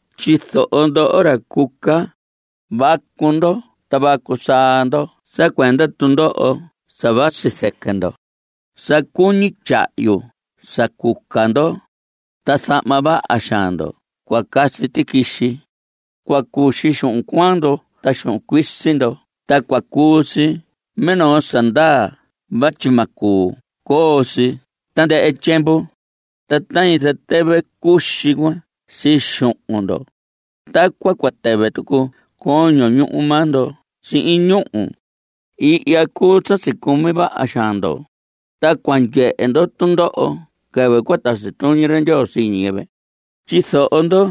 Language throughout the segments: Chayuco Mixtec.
Tyizoho ndoho ra cuca, vacu ndo ta vacu saa ndo sa cuenda tundoho sa vasi zɨquɨ ndo. Sa cuñi tyahyu sa cuca ndo, ta zahma vaha xaan ndo cua casi tiquixi. Cua cuxi xuhun cuaan ndo ta xuhun cuisi ndo ta cua cuu si minoo sa ndaa vatyi ma cuu coo si tandɨhɨ tyiemvu. Ta tañi zatɨvɨ cuxi cuan sii xuhun ndo, tacuan cua tɨvɨ tucu coño ñuhu maa ndo sihin ñúhu. Ihya cuu sa sicumi vaha xaan ndo, ta cua ndyehe ndo tundoho quɨvɨ cua tasi tuñi ra Ndyoo sii ñiyɨvɨ. Tyizoho ndo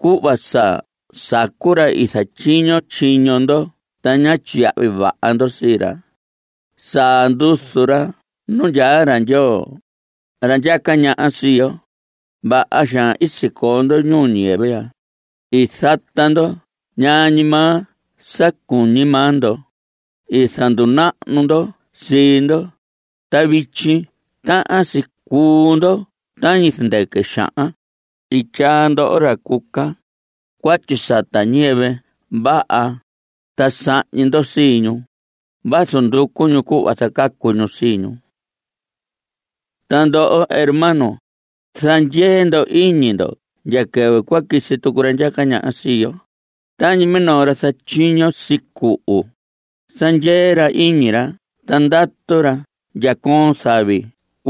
cuhva sa sacu ra i zatyiño tyiño ndo ta ñá tyiyahvi vaha ndo sii ra. Saa nduzu ra nuu ra Ndyoo, ra ndyaca ñaha sii yo. Vaha xaan i sicoo ndo ñuu ñiyɨvɨ ya. I zata ndo ñaa ñi maa sa cuñi maa ndo. I zandunahnu ndo sii ndo, ta vityi tahan si cuu ndo tañi zɨndɨquɨ xahan. I tyaa ndoho, ra cuca, cuatyi sata ñiyɨvɨ vaha, ta sahñi ndo sii ñu, vazu nducu ñu cuhva zacacu ñu sii ñu. Ta ndoho hermanos, zandyee ndo iñi ndo ndya quɨvɨ cua quisi tucu ra ndyaca ñaha sii yo. Tañi minoo ra zatyiño sicuhu, zandyee ra iñi ra ta ndatu ra ndya coon zavi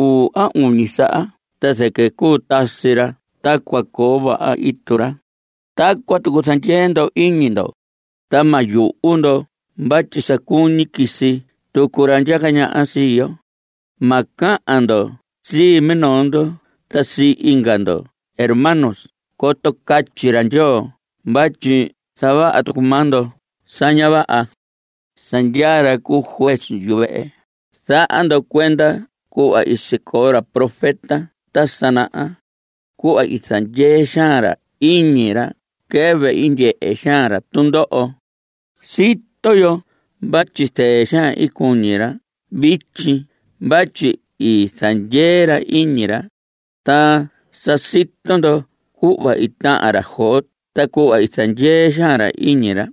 uu a uñi saha ta zɨquɨ cuu tasi ra ta cua coo vaha itu ra. Tacuan tucu zandyee ndo iñi ndo, ta ma yuhu ndo vatyi sa cuñi quisi tucu ra ndyaca ñaha sii yo. Ma cahan ndo sii minoo ndo ta sii inga ndo hermanos coto catyi ra Ndyoo vatyi zavaha tucu maa ndo sa ña vaha. Sa ndyaa ra cu juez yuvehe. Zaha ndo cuenda cuhva i sicoo ra profeta ta sa naha, cuhva i zandyee xaan ra iñi ra quɨvɨ i ndyehe xaan ra tundoho. Sito yo vatyi zɨɨ xaan cuñi ra vityi vatyi i zandyee ra iñi ra. Ta sa sito ndo cuhva i tahan ra Job ta cuhva i zandyee xaan ra iñi ra.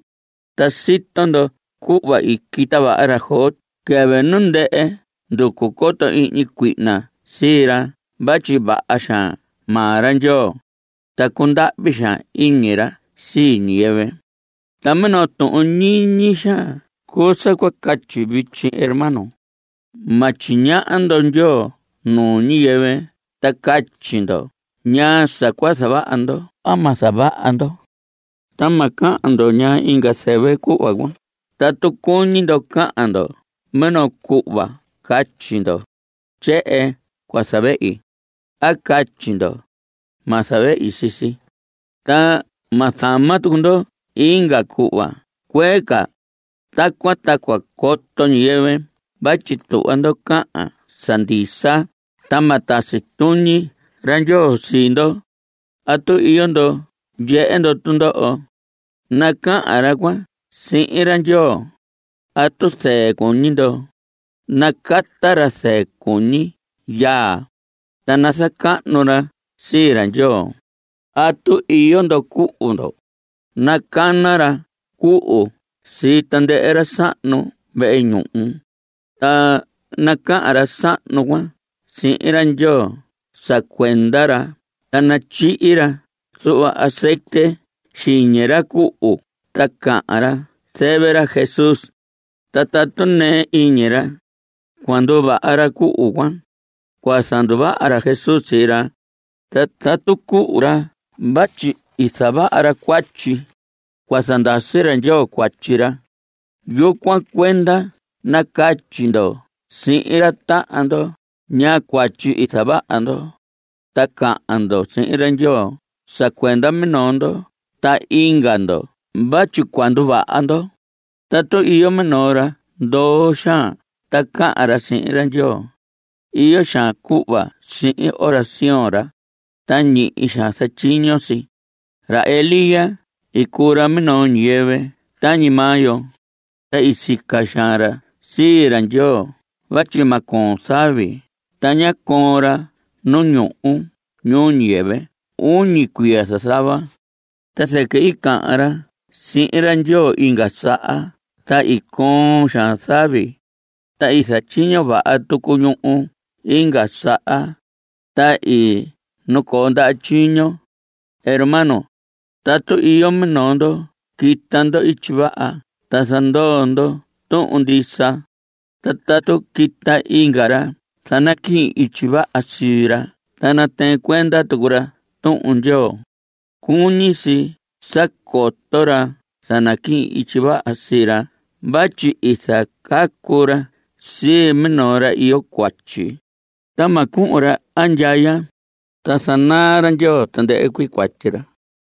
Ta sito ndo cuhva i quita vaha ra Job quɨvɨ nu ndɨhɨ nducu coto ihñi cuihna sii ra vatyi vaha xaan maa ra Ndyoo, ta cundahvi xaan iñi ra sii ñiyɨvɨ. Ta minoo tuhun ñiñi xaan cuu sa cua catyi vityi hermano. Ma tyiñaha ndo Ndyoo nuu ñiyɨvɨ ta catyi ndo ñaa sa cua zavaha ndo a ma zavaha ndo. Ta ma cahan ndo ñaa inga zɨvɨ cuhva cuan. Tatu cuñi ndo cahan ndo minoo cuhva catyi ndo: “Tyehen cua zavehi” a catyi ndo “ma zavehi sii si”, ta ma zama tucu ndo inga cuhva cuee ca. Tacuan ta cua coto ñiyɨvɨ vatyi tuhva ndo cahan sa ndisa, ta ma tasi tuñi ra Ndyoo sii ndo. ¿Atu iyo ndo ndyehe ndo tundoho? Nacahan ra cuan sihin ra Ndyoo. ¿Atu zɨɨ cuñi ndo? Nacata ra zɨɨ cuñi yaa, ta nazacahnu ra sii ra Ndyoo. ¿Atu iyo ndo cuhu ndo? Nacana ra cuhu sii tandɨhɨ ra sahnu vehe ñuhu, ta nacahan ra sahnu cuan sihin ra Ndyoo sa cuenda ra ta natyihi ra zuhva azetye xiñi ra cuhu ta cahan ra zɨvɨ ra Jesús. Ta tatu nɨɨ iñi ra, cua nduvaha ra cuhu cuan. Cua zanduvaha ra Jesús sii ra, ta tatu cuhu ra vatyi i zavaha ra cuatyi, cua zandasi ra Ndyoo cuatyi ra. Yucuan cuenda nacatyi ndo sihin ra tahan ndo ñaa cuatyi i zavaha ndo, ta cahan ndo sihin ra Ndyoo sa cuenda minoo ndo ta inga ndo vatyi cua nduvaha ndo. Tatu iyo minoo ra ndoo xaan ta cahan ra sihin ra Ndyoo, iyo xaan cuhva sihin oración ra. Ta ñihi xaan zatyiño si. Ra Elías i cuu ra minoo ñiyɨvɨ tañi maa yo. Ta sica xaan ra sii ra Ndyoo vatyi ma coon zavi. Ta ñá coon ra nu ñuhu ñuu ñiyɨvɨ uñi cuiya zazava. Ta zɨquɨ i cahan ra sihin ra Ndyoo inga saha ta i coon xaan zavi, ta i zatyiño vaha tucu ñuhu inga saha, ta i nacoo ndaha tyiño. Hermanos, tatu iyo minoo ndo quita ndo ityi vaha ta zandoo ndo tuhun ndisa, ta tatu quita inga ra zanaquihin ityi vaha sii ra ta natɨɨn cuenda tucu ra Tuhun Ndyoo, cuñi si sa coto ra zanaquihin ityi vaha sii ra vatyi i zacacu ra sii minoo ra iyo cuatyi, ta ma cuhun ra andyaya. Ta zanaa ra Ndyoo tandɨhɨ cuii cuatyi ra.